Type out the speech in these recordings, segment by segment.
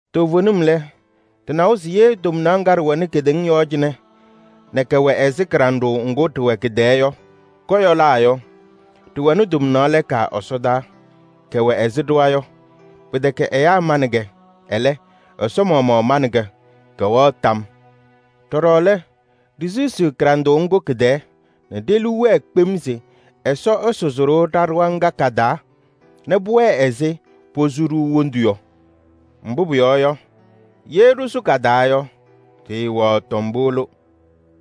Toovenim lɛ, ɖɩnawa se ye tomnaɣ ŋga ɖɩwɛnɩ kedeŋa yɔɔ cɩnɛ nɛ kɛwɛ ɛzɩ kɩɖanɖʋʋ ŋgʋ ɖɩwɛ kɩ-tɛɛ yɔ, kɔyɔlaa yɔ, ɖɩwɛnɩ tomnaɣ lɛɛka ɛsɔdaa, kɛwɛ ɛzɩ ɖɩɣa yɔ. Pɩtɛkɛ ɛyaa manɩ-kɛ, ɛlɛ, Ɛsɔ maɣmaɣ manɩ-kɛ. Kɛwɛɣ tam. Ɖɔɖɔ lɛ, ɖisisiɣ kɩɖanɖʋʋ ŋgʋ kɩ-tɛɛ nɛ ɖe-liu wɛɛ kpem se Ɛsɔ ɛsʋzɩ-ɖʋ ɖa-ɖɩɣa ŋga ka-taa nɛ pʋwɛɛ ɛzɩ posu-ɖʋ wondu yɔ. Mbʋ pʋyɔɔ yɔ, ye ɖɩsʋ ka-taa yɔ, ɖɩɩwɛɣ tombolo.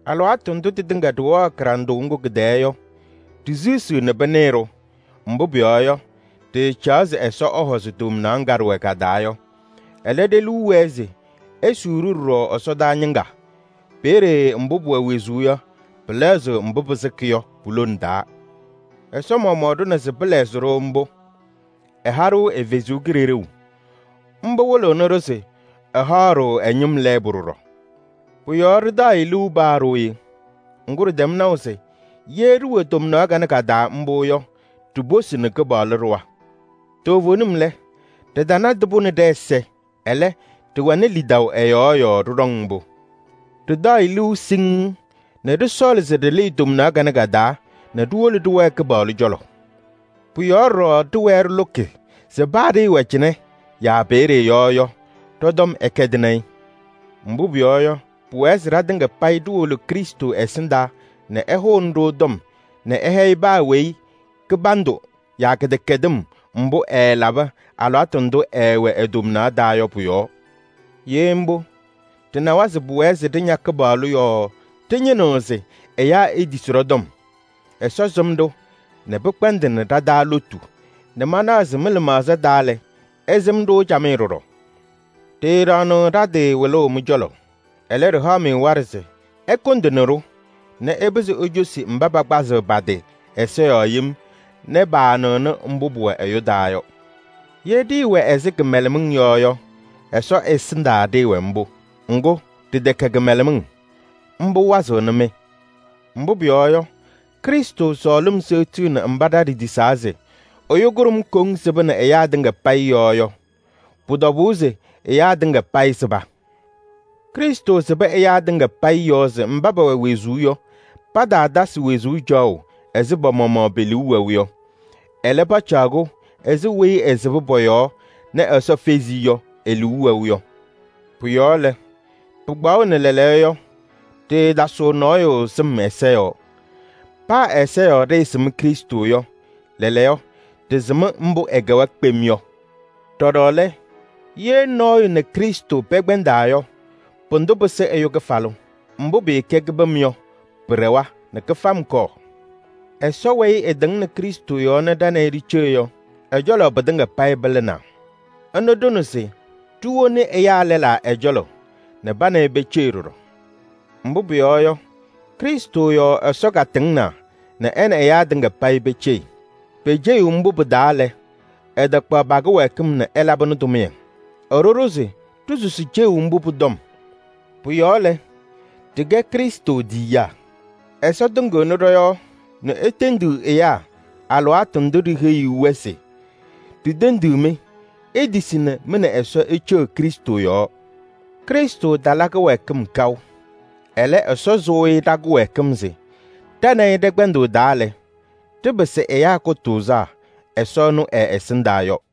Alɩwaatʋ ndʋ tɩtɩŋa ɖɩwɛɣ kɩɖanɖʋʋ ŋgʋ kɩ-tɛɛ yɔ, ɖisisiɣ nɛ pɩnɩɣ-ɖʋ. Mbʋ pʋyɔɔ yɔ, ɖɩɩcaɣ se Ɛsɔ ɛhɔzɩ tomnaɣ ŋga ɖɩwɛ ka-taa yɔ. Ɛlɛ, ɖe-liu wɛɛ se esuu-ɖʋ ɖɔɖɔ ɛsɔdaa ñɩŋga. Peeye mbʋ pʋwɛ wezuu yɔ, pɩlɛɣzɩɣ mbʋ pɩsɩkɩ yɔ pu-lone taa. Ɛsɔ maɣmaɣ ɖʋna se pɩlɛɣzɩ-ɖʋ mbʋ. Ɛha-ɖʋ ɛ-Kalɩzaɣ. Mbʋ wɩlɩɣnɩ-ɖʋ se ɛhaɣ-ɖʋ ɛ-ñɩm lɛɛbʋ ɖɔɖɔ. Pʋ-yɔɔ ɖɩtaɣ-ɩ liu paa ɖooye. Ŋgʋ, ɖɩtɛm naʋ se ye ɖɩwɛ tomnaɣ kanɛ ka-taa mbʋ yɔ, ɖiposini Kɩpaɣlʋ ɖɩɣa. Toovenim lɛ, ɖɩtanadɩ-pʋ nɛ ɖɛ-ɛza, ɛlɛ, ɖɩwɛnɩ lidaʋ ɛ-yɔɔ yɔɔ ɖɩɖɔŋ mbʋ. Ɖɩtaɣ-ɩ liu siŋŋ nɛ ɖɩsɔɔlɩ se ɖɩlɩɩ tomnaɣ kanɛ ka-taa nɛ ɖiwolo ɖɩwɛɛ Kɩpaɣlʋ cɔlɔ. Pʋ-yɔɔ ɖɔɖɔ ɖɩwɛɛ ɖɩlʋkɩ se paa ɖɩɩwɛ cɩnɛ yaa peeye yɔ yɔ, ɖɔ-tɔm ɛkɛdɩnɩ-ɩ. Mbʋ pʋyɔɔ yɔ, pʋwɛɛ se ɖatɩŋa payɩ ɖiwolo Krɩstʋ ɛsɩndaa nɛ ɛhʋnɩ-ɖʋ tɔm nɛ ɛhɛyɩ paa weyi kɩbandʋ yaa kɩdɛkɛdɩm mbʋ ɛɛlabɩ alɩwaatʋ ndʋ ɛɛwɛ e-tomnaɣ taa yɔ pʋ-yɔɔ. Ye mbʋ, ɖɩnawa se pʋwɛɛ se ɖɩña Kɩpaɣlʋ yɔɔ ɖɩñɩnɩɣ se ɛyaa etisi ɖɔ-tɔm. Ɛsɔ sɩm-ɖʋ nɛ pɩkpɛndɩnɩ ɖa-taa lotu nɛ manaɣ se mɩ-lɩmaɣza taa lɛ, ɩsɩm-ɖʋ camɩyɛ ɖɔɖɔ. Ɖɩɩɖaɣnɩɣ ɖa-tɩ wɩlʋʋ mɩ-cɔlɔ. Ɛlɛ, ɖɩhaɣ-mɩ waɖɛ se ɩkʋndɩnɩ-ɖʋ nɛ ɩpɩzɩ icosi mba pakpazɩɣ pa-tɩ ɛza yɔɔ yem nɛ paanɩɣnɩ mbʋ pʋwɛ ɛyʋ taa yɔ. Ye ɖɩɩwɛ ɛzɩ kɩmɛlɛmɩŋ yɔ yɔ, Ɛsɔ ɛsɩndaa ɖɩɩwɛ mbʋ. Ŋgʋ, ɖɩtɛkɛ kɩmɛlɛmɩŋ. Mbʋ wazɩɣnɩ-mɩ. Mbʋ pʋyɔɔ yɔ, Krɩstʋ sɔɔlɩm seɣtiɣni mba ɖa ɖitisaa se: ɛyʋ kʋɖʋm koŋ sɩbɩnɩ ɛyaa tɩŋa payɩ yɔɔ yɔ. Pʋ-tɔbʋʋ se ɛyaa tɩŋa payɩ sɩba. Krɩstʋ sɩbɩ ɛyaa tɩŋa payɩ yɔɔ se mba pɛwɛ wezuu yɔ, pataatasɩ wezuu caɣʋ ɛzɩ pa-maɣmaɣ pe-liu wɛʋ yɔ. Ɛlɛ, pacaɣ-kʋ ɛzɩ weyi ɛsɩbɩ pɔ-yɔɔ nɛ Ɛsɔ fezi-i yɔ, e-liu wɛʋ yɔ. Pʋ-yɔɔ lɛ, pɩkpaɣʋnɩ lɛɛlɛɛyɔ yɔ, ɖɩɩtasɩɣ nɔɔyʋ sɩm ɛza yɔɔ. Paa ɛza yɔɔ ɖɩɩsɩm Krɩstʋ yɔ, lɛɛlɛɛyɔ, ɖɩsɩm mbʋ ɛkɛwa kpem yɔ. Ɖɔɖɔ lɛ, ye nɔɔyʋ nɛ Krɩstʋ pɛkpɛndaa yɔ, pʋdʋ pɩsɩ ɛyʋ kɩfalʋ. Mbʋ pɩɩkɛ kɩbɩm yɔ, pɩɖɛwa nɛ kɩfam kɔɔ. sɔ weyi ɛtɩŋnɩ Krɩstʋ yɔɔ nɛ ɖa nɛ ɩ ɖiceɣ yɔ, ɛ-cɔlɔ pɩtɩŋa payɩ pɩlɩnaa. Ɛnʋ ɖʋnɩ-ɖʋ se ɖiwoni ɛyaa lɛlaa ɛ-cɔlɔ nɛ pa nɛ ɩ peceɣ ɖɔɖɔ. Mbʋ pʋyɔɔ yɔ, Krɩstʋ yɔɔ Ɛsɔ katɩŋnaa nɛ ɛ nɛ ɛyaa tɩŋa payɩ peceɣ. Pe-ceɣu mbʋ pɩ-taa lɛ, ɛtaakpaɣ pa-kɩwɛɛkɩm nɛ ɛlabɩnɩ tʋmɩyɛ. Ɛɖʋ-ɖʋ se ɖisusi ceɣu mbʋ pʋ-tɔm. Pʋ-yɔɔ lɛ, ɖɩkɛ Krɩstʋ tiyiyaa. Ɛsɔ tɩŋɩɣnɩ ɖɔ-yɔɔ nɛ etendiɣ ɛyaa alɩwaatʋ ndʋ ɖiheyiɣ-wɛ se: “Ɖitendiɣ-mɩ, itisi nɛ mɩ nɛ Ɛsɔ iceɣ Krɩstʋ yɔɔ. Krɩstʋ tala kɩwɛɛkɩm kaʋ. Ɛlɛ, Ɛsɔ sʋʋ-ɩ ɖa-kɩwɛɛkɩm se ɖa nɛ ɩ ɖɛ-kpɛndʋʋ taa lɛ, ɖɩpɩsɩ ɛyaa kʋtʋʋzaa Ɛsɔ ɛnʋ ɛ-ɛsɩndaa” yɔ.